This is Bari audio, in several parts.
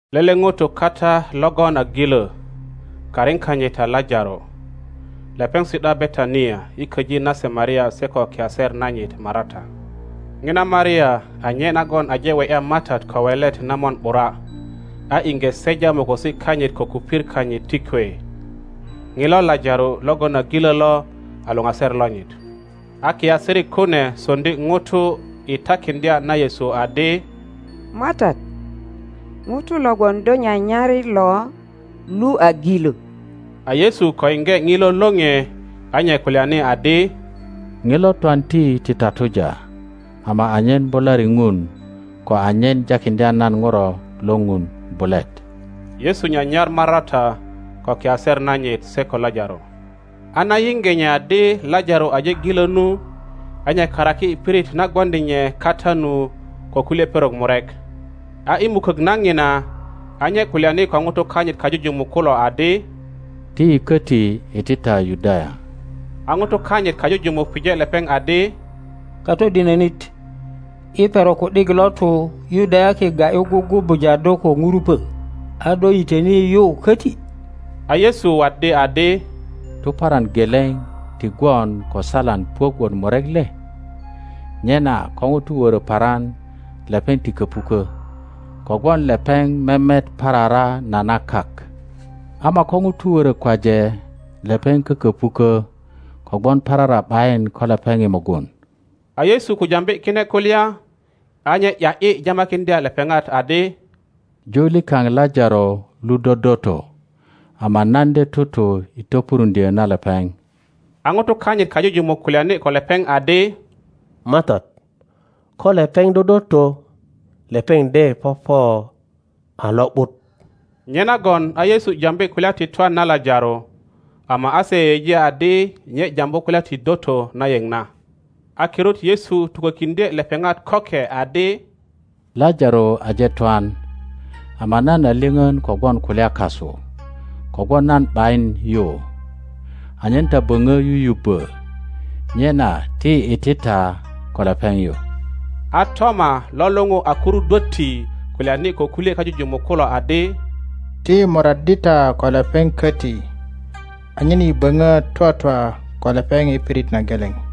Lele ŋuto kata logon a gilö, A karin kanyit a Lajaro. Lepeŋ si’da Betania i köji nase Maria se ko kiaser nanyit Marata. Ŋina Maria a nye nagon aje we ’ya MATAT ko welet na mon ’bura, a iŋge seja mokosi kanyit ko kupir kanyit ti kwe. Ŋilo Lajaro logon a gilö lo a luŋaser lonyit. A kiasirik kune soŋdi ŋuto i takiŋdya na Yesu adi, MATAT, ŋuto logon do nyanyar lo lu a gilö. A Yesu ko yiŋge ŋilo lore a nye kulyani adi, Ŋilo twanti ti tatuja, ama anyen bulari Ŋun ko anyen jakiŋdya nan Ŋuro lo Ŋun bulet. Yesu nyanyar Marata ko kiaser nanyit se ko Lajaro. A na yiŋge nye adi Lajaro aje gilö nu, a nye karaki i pirit na gwoŋdi nye kata nu ko kulye perok murek. A i mukök na ŋina a nye kulyani ko ŋutu kanyit kajujumuk kulo adi, Ti yi köti iti ta Yudaya. A ŋutu kanyit kajujumuk pije lepeŋ adi, Katodinönit, i perok ku ’dik lo tu Yudayaki ga ’yu gugubuja do ko ŋurupö, a do yitöni yu köti? A Yesu waddi adi, Tuparan geleŋ ti gwon ko saalan puök wot murek le? Nyena ko ŋuto wörö paran lepeŋ ti köpukö, kogwon lepeŋ memet parara na na kak; Ŋoma ko ŋuto wörö kwaje, lepeŋ kököpuko kogwon parara ’bayin ko lepeŋ i mugun. A Yesu ko jambi kine kulya, a nye ’ya ’yi jamakiŋdya lepeŋat adi, Ju likaŋ Lajaro lu dodoto; ama nan de tutu i topuruŋdyö na lepeŋ. a ŋutu kanyit kajujumuk kulyani ko lepeŋ adi, MATAT, ko lepeŋ dodoto, lepeŋ de popo a lo ’but. Nyenagon a Yesu jambi kulya ti twan na Lajaro, ama a se, yeyeji adi nye jambu kulya ti doto na yeŋ na. A kirut Yesu tukökiŋdye lepeŋat köke adi, Lajaro aje twan, ama nan a lyoŋon kogwon kulya kasu kogwon nan ’bayin yu, anyen ta böŋö yuyubbö. Nyena ti yi iti ta ko lepeŋ yu. A Toma lo luŋu a Kurudwötti kulyani ko kulye kajujumuk kulo adi, Ti yi moraddi ta ko lepeŋ köti anyen yi böŋo twatwa ko lepeŋ i pirit na geleŋ.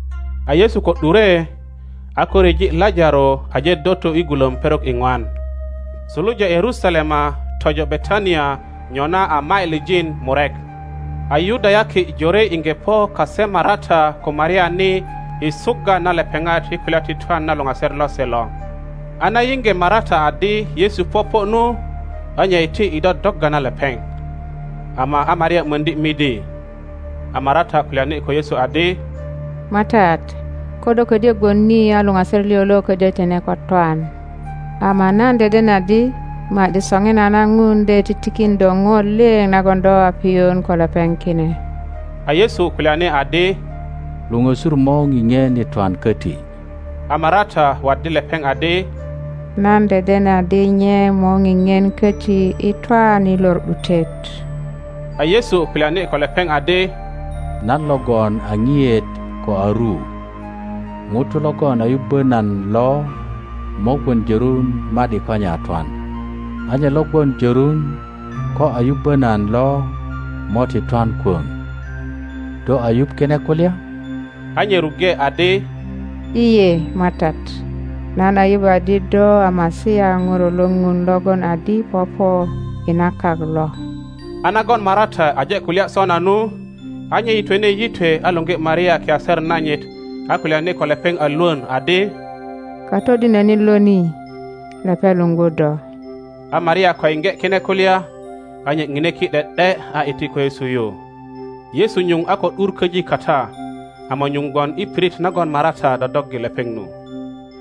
A Yesu ko ’dure, a ko ryeji Lajaro aje doto i gulöm perok iŋwan. Suluja Yerusalema tojo Betania nyona a mailijin murek, a Yudayaki jore iŋge po kase Marata ko Maria ni i sugga na lepeŋat i kulya ti twan na luŋaser lose lo. A na yiŋge Marata adi Yesu popo nu, a nye iti i dodogga na lepeŋ; ama a Maria möŋdi midi. A Marata kulyani ko Yesu adi, MATAT, ko do ködyö gwon ni a luŋaser liŋ lo ködyö tine ko twan. Ama nan deden adi ma ’di soŋinana Ŋun de titikin do ŋo liŋ nagon do a piyun ko lepeŋ kine. A Yesu kulyani adi, Luŋösur mo ŋiŋien i twan koti. a Marata waddi lepeŋ adi, Nan deden adi nye mo ŋiŋien köti i twan i lor ’dutet. A Yesu kulyani ko lepeŋ adi, Nan logon a ŋiet ko a ru. Ŋuto logon a yubbo nan lo mo gwon jörun ma ’di ko nye a twan; a nye lo gwon jörun ko a yubbö nan lo mo ti twan kwöŋ. Do a yuŋ kine kulya? a nye ruŋge adi, lye, MATAT; nan a yuŋ adi do a Masia Ŋuro lo Ŋun logon adi popo i na kak lo. A nagon Marata aje kulya sona nu, a nye yitwene yitwe a luŋgi Maria kiaser nanyit a kulyani ko lepeŋ a lwön adi. Katodinönit lo ni, lepeŋ luŋgu do. A Maria ko yiŋge kine kulya, a nye ŋine ki ’de ’de a iti ko Yesu yu. Yesu nyuŋ a ko ’dur köji kata, ama nyuŋ gwon i pirit nagon Marata dodoggi lepeŋ nu.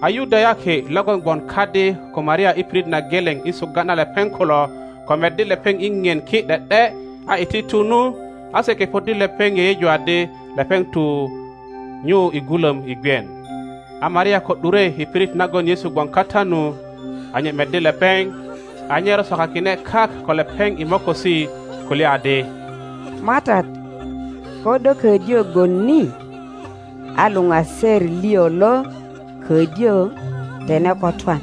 A Yudayaki logon gwon kadi ko Maria i pirit na geleŋ i sugga na lepeŋ kulo, ko meddi lepeŋ i ŋien ki ’de ’de a iti tu nu, a se kepoddi lepeŋ yeyeju adi lepeŋ tu nyu i gulöm i gwien. A Maria ko ’dure i pirit nagon Yesu gwon kata nu, a nye meddi lepeŋ, a nye rosokakine kak ko lepeŋ i mokosi, kulya adi, MATAT, ko do ködyö gwon ni a luŋaser liŋ lo ködyö tine ko twan.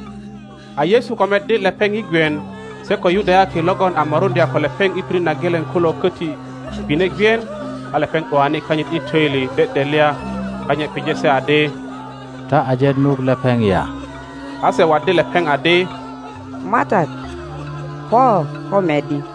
A Yesu ko meddi lepeŋ i gwien, se ko Yudayaki logon a moruŋdya ko lepeŋ i pirit na geleŋ kulo köti gwine gwien, a lepeŋ ’duani kanyit i töili dedelya, a nye pije se adi, Ta aje nuk lepeŋ ya? A se waddi lepeŋ adi, MATAT, po ko meddi.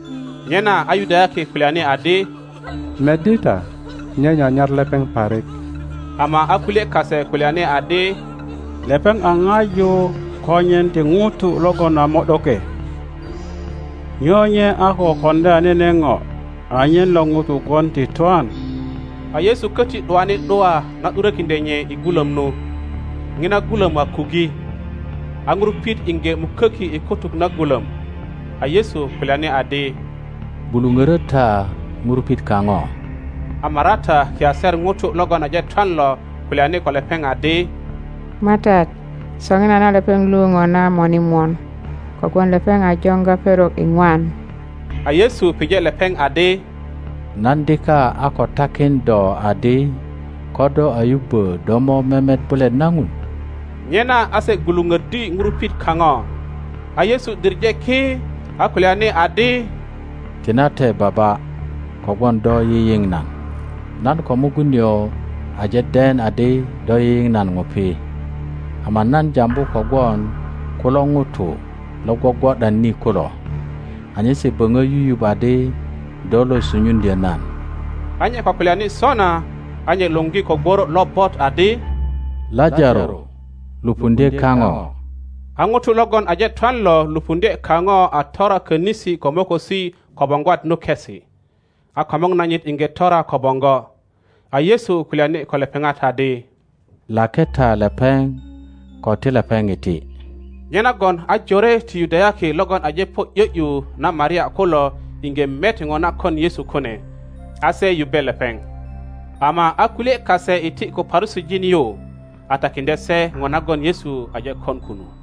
Nyena a Yudayaki kulyani adi, Meddi ta, nye nyanyar lepeŋ parik. Ama a kulye kase kulyani adi, Lepeŋ a ŋaju konyen ti ŋuto logon a mo ’doke, nyo nye a ko koŋdya nene ŋo anyen lo ŋuto gwon ti twan? A Yesu köti ’duani ’dua na ’durökiŋdye nye i gulöm nu. ŋina gulöm a kuggi, a ŋurupit iŋge muköki i kutuk na gulöm. A Yesu kulyani adi, Gwuluŋörö ta ŋurupit kaŋo. A Marata kiaser ŋuto logon aje twan lo kulyani ko lepeŋ adi, MATAT, soŋinana lepeŋ lu ŋona mone mon, kogwon lepeŋ a joŋga perok iŋwan. a Yesu pije lepeŋ adi, Nan dika a ko takin do adi ko do a yubbö do mo memet bulet na Ŋuro? Nyena a se gwuluŋöddi ŋurupit kaŋo; a Yesu diŋe ki, a kulyani adi, Tinate Baba, kogwon do yiyiŋ nan. Nan ko mugun nio aje den adi do yiyiŋ nan ŋupi; ama nan jambu kogwon kulo ŋutu lo gwogwo ’dan ni kulo, anyen se böŋö yuyuŋ adi do lo sunyuŋdyö nan. A nye ko kulyani sona, a nye luŋgi ko gworo lobot adi, Lajaro, lupundye kaŋo. A ŋuto logon aje twan lo lupuŋdye kaŋo a tora könisi ko mokosi ko boŋgwat nukesi, a komor nanyit iŋge tora ko boŋgo. A Yesu kulyani ko lepeŋat adi, Lake ta lepeŋ ko ti lepeŋ iti. Nyenagon a jore ti Yudayaki logon aje po i ’yö ’yu na Maria kulo iŋge met ŋo na kon Yesu kune, a se yubbe lepeŋ, ama a kulye kase iti ko Parusijin yu, a takiŋdye se ŋo nagon Yesu aje kon kunu.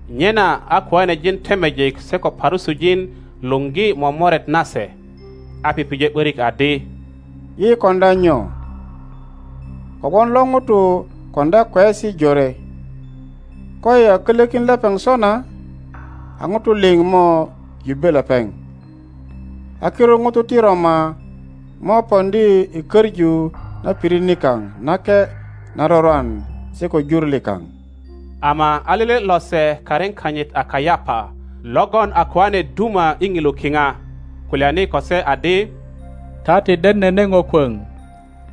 Nyena a kiŋanejin temejik se ko Parusijin luŋgi momoret nase, a pije ’börik adi, Yi koŋdya nyo? kogwon lo ŋuto koŋdya kweyesi jore. Koyi a kölökin lepeŋ sona, a ŋutu liŋ mo yubbe lepeŋ, a kirut ŋutu ti Roma mo poŋdi i köŋu na pirit nika) nake na rurwan se ko jur likaŋ. Ama a lele lose karin kanyit a Kayapa logon a kijane duma i ŋilu kiŋa, kulyani ko se adi, Ta ti den nene ŋo kwöŋ;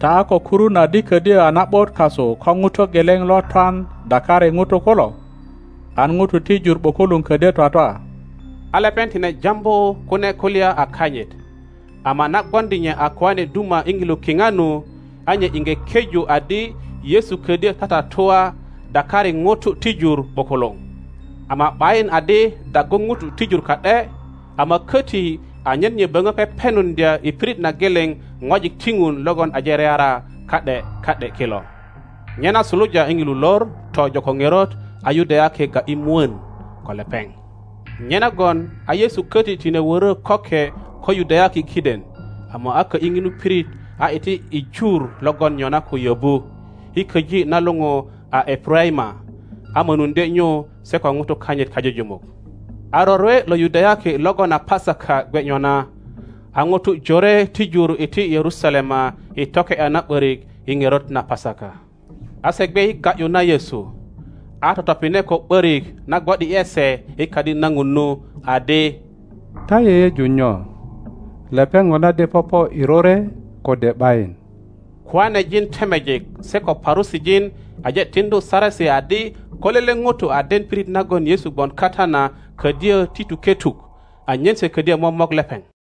ta a ko kurun adi ködyö a na ’but kasu ko ŋuto geleŋ lo twan dakari ŋutu kulo, an ŋutu ti jur ’bukuluŋ ködyö twatwa. A lepeŋ tine jambu kune kulya a kanyit, ama na gwoŋdi nye a kijane duma i ŋilu kiŋa nu, a nye iŋge keju adi Yesu ködyö tatatua dakari ŋutu ti jur ’bukuluŋ, ama ’bayin adi daggu ŋutu ti jur ka ’de, ama köti anyen nye böŋö pepenuŋdya i pirit na geleŋ ŋwajik ti Ŋun logon aje reara ka ’de ka ’de kilo. Nyena suluja i ŋilu lor tojo ko ŋerot a Yudayaki ga ’yi mwön ko lepeŋ. Nyenagon a Yesu köti tine wörö köke ko Yudayaki kiden, ama a kö ’yi ŋinu pirit a iti i jur logon nyona ko yöbu, i köji na luŋu a Epuraima, a mönuŋdye nyu se ko ŋutu kanyit kajujumuk. A rorwe lo Yudayaki logon a Pasaka gwe nyona, a ŋutu jore ti jur iti Yerusalema i toke ’ya na ’börik i ŋerot na Pasaka. A se gwe i ga ’yu na Yesu, a totopine ko ’börik na gwo ’di ’e se i Kadi na Ŋun nu, adi, Ta yeyeju nyo? Lepeŋ ŋona de popo i rorwe kode ’bayin? Kiŋanejin temejik se ko Parusijin aje tiŋdu saresi adi ko lele ŋuto a den pirit nagon Yesu gwon kata na, ködyö ti tuke tuk, anyen se ködyö momok lepeŋ.